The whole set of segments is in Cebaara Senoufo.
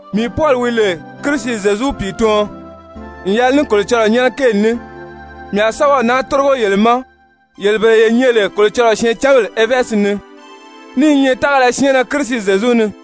Mii Pɔli wi lè Kirisi Zyezu pìituɔn n yɛlɛ ní Kolocɔlɔɔ nyɛ́nɛ kéeli ní, mii a sɛ́bɛw naa tórigo yele ma, yele bele ye nyɛ lè Kolocɔlɔɔ syɛɛncanbèle [Efɛzi ni], ní i nyɛ tágala syɛɛnnɛ Kirisi Zyezu ni.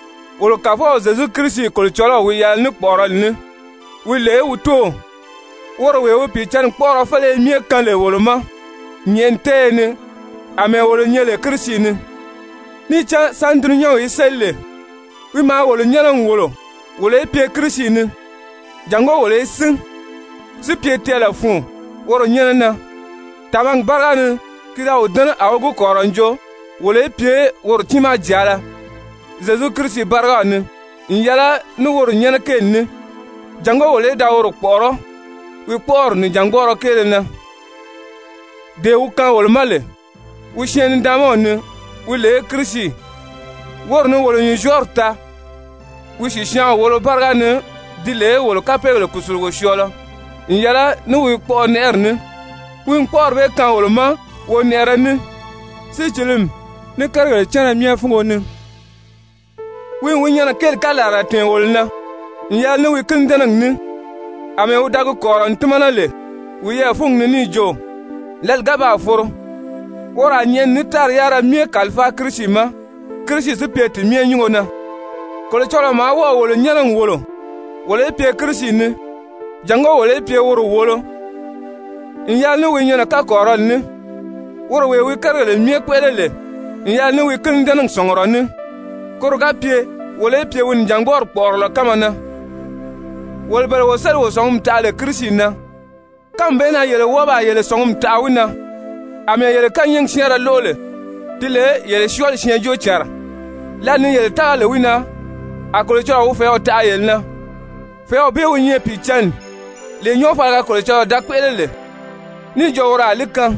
Wolo Kàfɔw Zyezu Kirisi Kolocɔlɔw wi yɛlɛ ní kpɔ̀ʔɔrɔli ní wi lè wi Tóow, woro wee wi Pìicǎnni kpɔ́ʔɔrɔ féleye myɛ kaan lè wolo ma nyɛ̀ʔɛni tɛ́ɛyɛ ni àmɛɛ wolo nyɛ lè Kirisi ni. Níì cán sáni dulunyanw í séli lè, wi maa wolo nyɛ́nɛ n wòlo wolo í pye Kirisi ni, jàngó wolo í sín, si pye tɛɛlɛ fun woro nyɛ́nɛ na. Tàmagi báriga ni ki da wi dɛ́nɛ, a wi gi kɔ̀rirɔ n jo wolo í pye woro tiimaa jàala Zyezu Kirisi bárigaw ni n yɛlɛ ní woro nyɛ́nɛ kéeli ní, jàngó wolo í da woro kpɔ̀ʔɔrɔ́ wi kpɔ́ʔɔri nìjangbɔɔrɔ kéele na, dee wi kaan wolo ma lè wi Syɛɛn-nidaanmaw ni, wi lè Kirisi. Woro ni wolo nyùnzyɔɔri taa wi sìsyaanw wolo báriga ni ti lè wolo kapeegèle kùsulugo syɔɔlɔ n yɛlɛ ní wi kpɔʔɔnɛʔɛri ní. Wi n kpɔ́ʔɔri bee kaan wolo ma wonɛʔɛrɛ ní, sícilimi, ní kérigèle cánna myɛ fúngo ni. Wi n wi nyɛnɛ kéeli kalarala tɛ̀ɛn wolo na n yɛlɛ ní wi kínidɛnɛgi ní, àmɛɛ wi da gi kɔ̀rirɔ n tímana lè wiyɛɛ fúngi ni níì jo, lǎli ga baa foro, woro a nyɛ̀ʔɛni ní tári yárira myɛ kàlifáa Kirisi ma, Kirisi si pye ti myɛ nyúngo na. Kolocɔlɔɔ maa wɔ́ɔ̀ wolo nyɛ́nɛ n wòlo, wolo í pye Kirisi ni jàngó wolo í pye woro wòolo n yɛlɛ ní wi nyɛnɛ kakɔrirɔli ní, woro wee wi kérigèle myɛ kpéʔele lè n yɛlɛ ní wi kínidɛnɛgi sɔ̀ngurɔ ní, koro ga pye wolo í pye wi nìjangbɔɔri kpɔ̀ʔɔrɔlɔ kánma na, wolo bele wo sélì wo sɔ̀ngumi taʔa lè Kirisi na. Kánmi bee na yele wɔ́ɔ baa yele sɔ̀ngumi taʔa wi na àmɛɛ yele kányɛɛgi syɛ́ɛnrɛ lóʔo lè, ti lè yele syɔɔli syɛɛnjóocànra, lǎli ni yele tága lè wi na, a Kolocɔlɔɔ wi fɛ̀ɛ́w taʔa yele na, fɛ̀ɛ́w bee wi nyɛ Pìicǎnni, lee nyɔɔfaliga Kolocɔlɔɔ da kpéʔele lè níì jo woro a li kaan,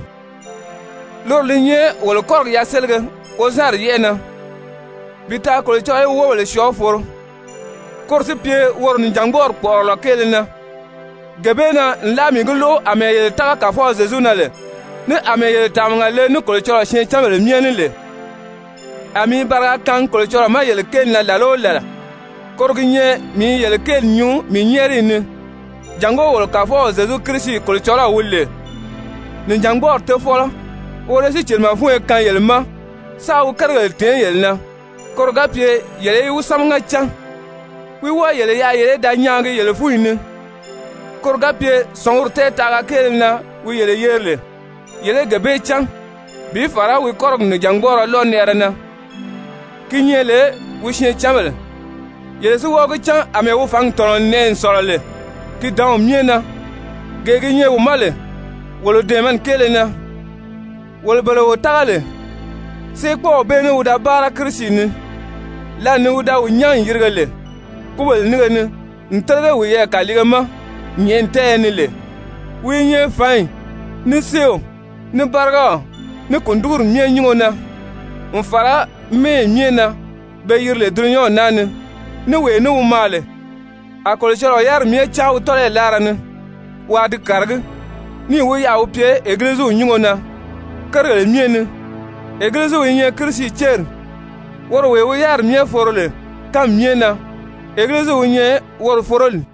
loro li nyɛ wolo kɔ́rigi yaselige wozanri yɛ́ʔɛ na, bi taa Kolocɔlɔɔ í wi wóbèle syɔɔ foro, koro si pye woro nìjangbɔɔri kpɔ̀ʔɔrɔlɔ kéele na. Gee bee na nlaa mii gi lóʔo àmɛɛ yele tága Kàfɔw Zyezu na lè, ní àmɛɛ yele tàmaga le ní Kolocɔlɔɔ syɛɛncanbèle myɛ ní lè, a mii i bariga kaangi Kolocɔlɔɔ ma yele kéeli na làla o làla, koro gi nyɛ mii i yele kéeli nyuu mii nyɛ́ɛriyi ni, jàngó wolo Kàfɔw Zyezu Kirisi Kolocɔlɔw, wi lè nìjangbɔɔri Tofɔlɔ, woro í sícilimɛ fúnyo kaan yele ma, sáā wi kérigèle tèé yele na, koro ga pye yele í wi sámaga cán. Wi wɔ́ɔ yele yaʔa yele í da nyaagi yele fúnyi ni, koro ga pye sɔ̀ngumi tɛɛtaʔaga kéele na wi yele yeri lè, yele í gee bee cán bi fàra wi kɔ́rigi nìjangbɔɔrɔ lɔnɛʔɛrɛ na, gi nyɛ lè wi syɛɛncanbèle, yele si wɔ́ɔ gi cán àmɛɛ wi fǎngi tɔ̀nɔ n nɛʔɛ n sɔ̀lɔ lè ki dǎnw myɛ na, gee gi nyɛ wi ma lè wolo dɛ̀ɛmɛni kéele na, wolo bele wo tága lè. Séekpɔɔw bee ní wi da báara Kirisi ni, lǎli ni wi da wi nyán n yirige lè kúbèle nínge ni n télege wiyɛɛ kàliige ma nyɛ̀ʔɛni tɛ́ɛyɛ ni lè. Wi i nyɛ fǎnyi, ní séew, ní bárigaw, ní kùndigiri myɛ nyúngo na n fàra mɛ́ɛyi myɛ na be yiri lè dulunyanw naa ni, ní wee ní wi maa lè. A Kolocɔlɔɔ yáriri myɛ cáan wi tɔ́lɔyi láara ni waa di kàragí, níì wi yaʔa wi pye Egiliziw nyúngo na kérigèle myɛ ni. Egiliziw i nyɛ Kirisi céri. Woro wee wi yáriri myɛ foro lè kánmi myɛ na, Egiliziw wi nyɛ woro foroli.